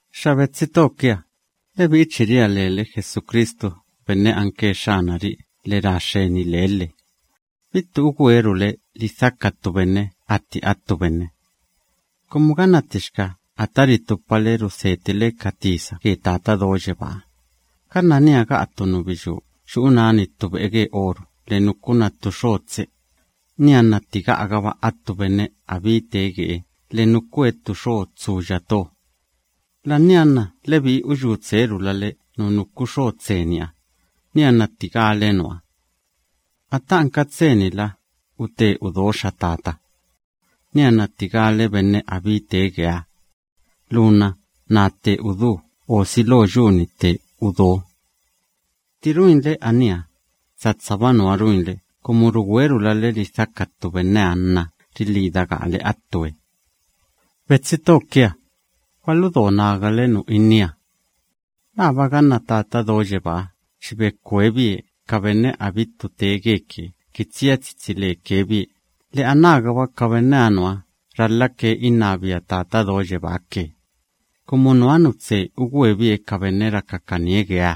Xa betsi to kia, lebi'i chi ria lele Jesucristu benne anke Xxanari'i lhe ra xxeni lebie lhe. Bittu ugwerule lidhaka ttu benne atti attu benne. Kumu ganna ttixka ata ritupale rulhale ge Tata Do Yebáha, ganna niha ga'a ttu nubiyú yu'u náni ttu be'e ge oru lhe nukuna ttu xo tse, nianna tti ga'agaba attu benne abittu tee gebie lhe nukue ttu xo tsuya to, la'ania nna lebi'i uyú tserulale nu nuku xo tseniha, nianna tti gale nuha: “Ata anka tse‑nila, ute udo xa tata.” Nianna tti gale benne abí tee geeha: “Lu nna naa tte udú o si lo yu‑ni tte udo.” Tti ruinle aníha, satsaba nuha ruinle kumu rugwerulale lidhaka ttu benneha nna rilhida gaale attue. Betsi to kia, gwaludo nagale nu innía. ¿Laaba ganna Tata Do Yebáha chi bekwebie ka benne abittu tee geke kini tsia tsitsi leke bie lhe anágaba ka benneha nuha ralhake innabia Tata Do Yebáha ke, kumu nuha nu tse ugwebie ka benne rakakanie gebie?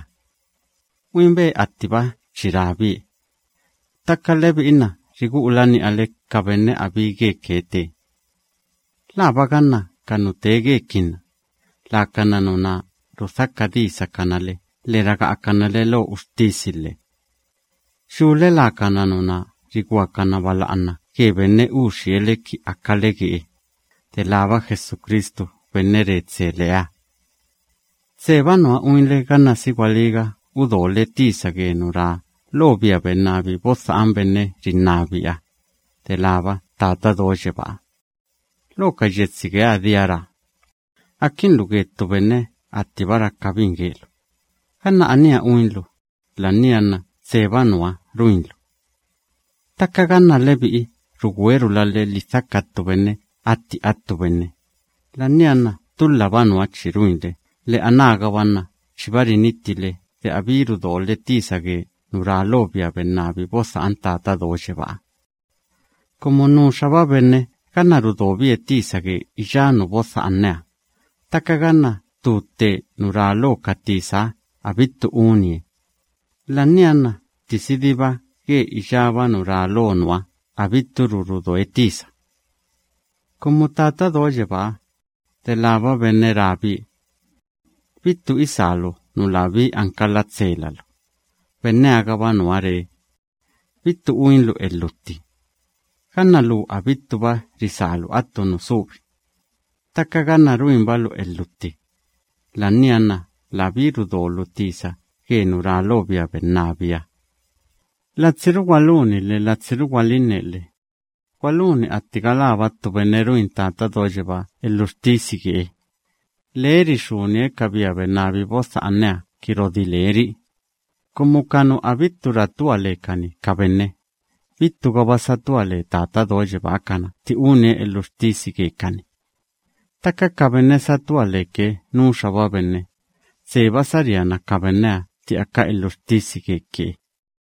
Uinbe attiba chi rabie. Ttaka lebi'i nna rigu'ula ni'ale ka benne abittu geke tee. ¿Laaba ganna ka nu tee gekinna, lakana nuná rudhaka disakana le lhe raga'akana le lo uxtisi lhe? Yule lakana nuná riguakana bala'ana ge benne uxie le kini akale gebie, delába Jesucristu benne re tse leha. Tseba nuha uinle ganna si gwalíga udole tisa ge nu ra lo bia bennabi bodha'an benne rinnabiaha, delába Tata Do Yebáha. Lo ka yetsi geeha, dia ra: “Akinlu ge ttu benne attiba rakabin gelu”, ganna aníha uinlu, la'ania nna tseba nuha ruinlu. Ttaka ganna lebi'i rugwerulale lidhaka ttu benne atti attu benne, la'ania nna tulhaba nuha chi ruinle lhe anágaba nna chiba rinittile de abittu rudole tisa ge nu ra lo bia bennabi bodha'an Tata Do Yebáha. Kumu nuxaba benne ganna rudobie tisa ge iyá nu bodha'aneha, ttaka ganna ttu tte nu ra lo ka tisaha abittu unie, la'ania nna ttisidiba ge iyába nu ra lo nuha abitturu rudoe tisa. Kumu Tata Do Yebáha, delába benne rabie: “Bittu isálu nu labí anka latselalu”, benneha‑gaba nuha ree: “Bittu uinlu elhutti.” Ganna lu abittuba risálu attu nu subi, ttaka ganna ruinbalu elhutti, la'ania nna labí rudolu tisa ge nu ra lo bia bennabiha. Latsiru gwaluni lhe latsiru gwalinne lhe. Gwaluni atti galába ttu benne ruin Tata Do Yebáha elhuxtisi gebie. Lee rixúnie bia bennabi bodha'aneha kini rodilábie ri'i. Kumu ka nu abittu ratua lekani ka benne, bittugaba satua le Tata Do Yebáha kana tti unie elhuxtisi gekani. Ttaka ka benne satua leke nuxaba benne, tseba saríana ka benneha tti aka elhuxtisi geke.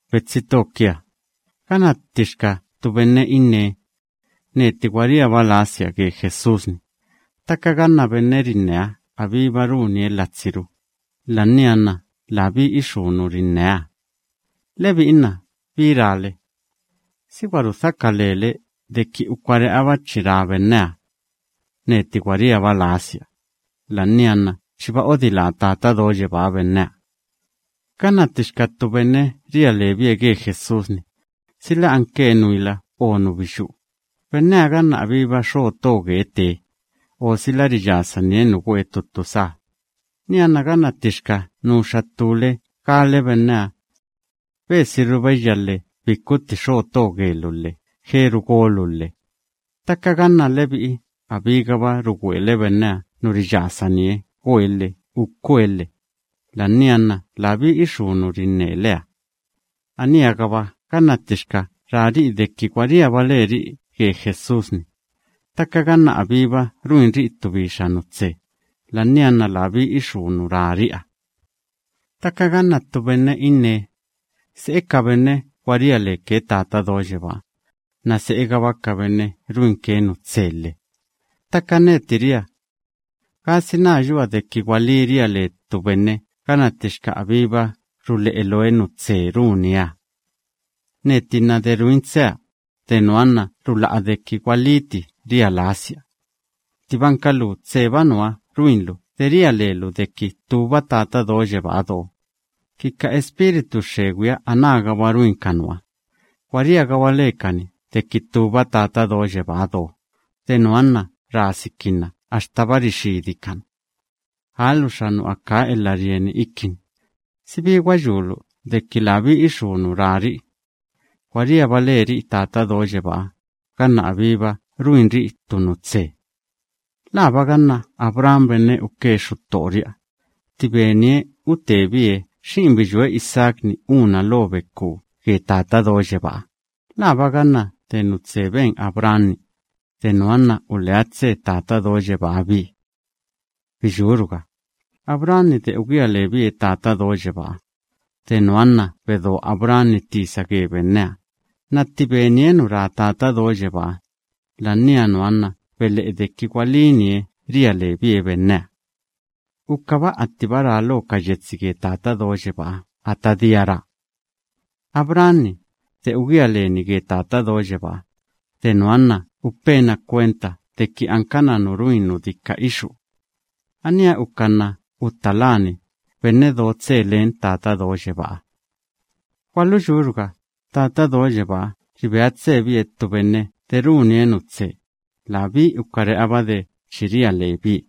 Betsi to kia, ganna ttixka ttu benne innee: “Neti gwa riaba lasia ge Jesús‑ni”, ttaka ganna benne rinneha abíba runie latsiru, la'ania nna labí ixú nu rinneeha. Lebi'i nna, ¿bí rale? ¿Si gwa rudhaka lele deki ukare'aba chi ra benneha: “Neti gwa riaba lasia”, la'ania nna chiba odilá Tata Do Yebáha benneha? Ganna ttixka ttu benne ria lebie ge Jesús‑ni, sila anke nuila o nubiyú, benneha ganna abíba xo to gebie tee, o sila riyasanie nu goe ttu ttu sá, nianna ganna ttixka nuxa ttúle gale benneha: “Besiru beyya lhe bikutti xo to gelu lhe jeru golu lhe”, ttaka ganna lebi'i abígaba rugwele benneha nu riyasanie goe lhe ukue lhe, la'ania nna labí ixú nu rinneleha. Aníha‑gaba ganna ttixka rari'i deki gwa riaba leri'i ge Jesús‑ni, ttaka ganna abíba ruinri'i ttu bixa nu tse, la'ania nna labí ixú nu rinneri'iha. Ttaka ganna ttu benne innee: “Se'e ka benne gwa ria leke Tata Do Yebáha, nna se'egaba ka benne ruinke nu tse lhe”, ttaka neti ria: “¿Gasina yua deki gwalí ria le ttu benne ganna ttixka abíba rule'e looe nu tse runieha? Neti nna de ruin tsea, de nuha nna rula'a deki gwalíti ria lasia bie. Ttibanka lu tseba nuha ruinlu de ria lelu deki ttúba Tata Do Yebáha do, ki ka espíritu xxegwiha anágaba ruin ka nuha, gwa riagaba lekani deki ttúba Tata Do Yebáha do, de nuha nna rasikinna axtaba rixidikana.” ¡Aaluxa nu akaa elha rieni ikini! ¿Si bi gwa yulu deki labí ixú nu rari'i: “Gwa riaba leri'i Tata Do Yebáha” ganna abíba ruinri'i ttu nu tse? ¿Laaba ganna Abraham benne uke xuttori'iha, tti benie utebie xi'in biyúe Isaac‑ni úna lo bekú ge Tata Do Yebáha, laaba ganna de nu benieha nna ulea tse Tata Do Yebáha bie? Biyúruga, Abraham‑ni de ugía lebie Tata Do Yebáha, de nuha nna gwa bedo Abraham‑ni tisa gebie, nna tti benie nu ra Tata Do Yebáha, la'ania nuha nna bele'e deki gwalínie ria lebie benneha. Ukaba attiba ra lo ka yetsi ge Tata Do Yebáha ata dia ra: “Abraham‑ni, de ugía lebie ge Tata Do Yebáha, de nuha nna upe bie kwenta deki anke benne runi nu dika ixú.” Aníha uka nna utta lábie benne do tse len Tata Do Yebáha. Gwaluyúruga, Tata Do Yebáha ribea tsebie benne de runie nu tse, labí ukare'aba de chi ria lebie.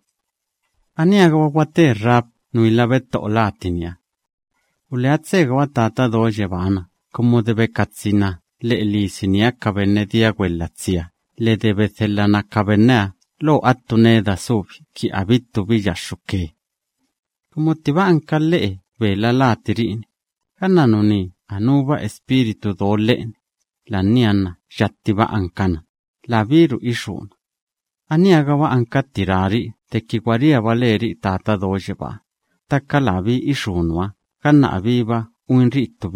Aníha‑gaba gwate Rahab nuila betto'o latiniha. Ulea tsegaba Tata Do Yebáha na kumu de bekatsina lhe'e lisiniha ka benne dia gwelhatsiha lhe de bedhelhana ka benneha lo attu neda subi ki abittu biyaxxuke. Kumu ttiba anka lhe'e bela latiri'i‑ni, ganna nuní anúba espíritu do lhe'eni, la'ania nna yattiba ankana, labíru ixúna. Aníha‑gaba nuha anka tti rari'i deki gwa riaba leri'i Tata Do Yebáha, ttaka labí ixú nuha ganna abíba uinri'i ttu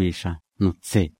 nu tse.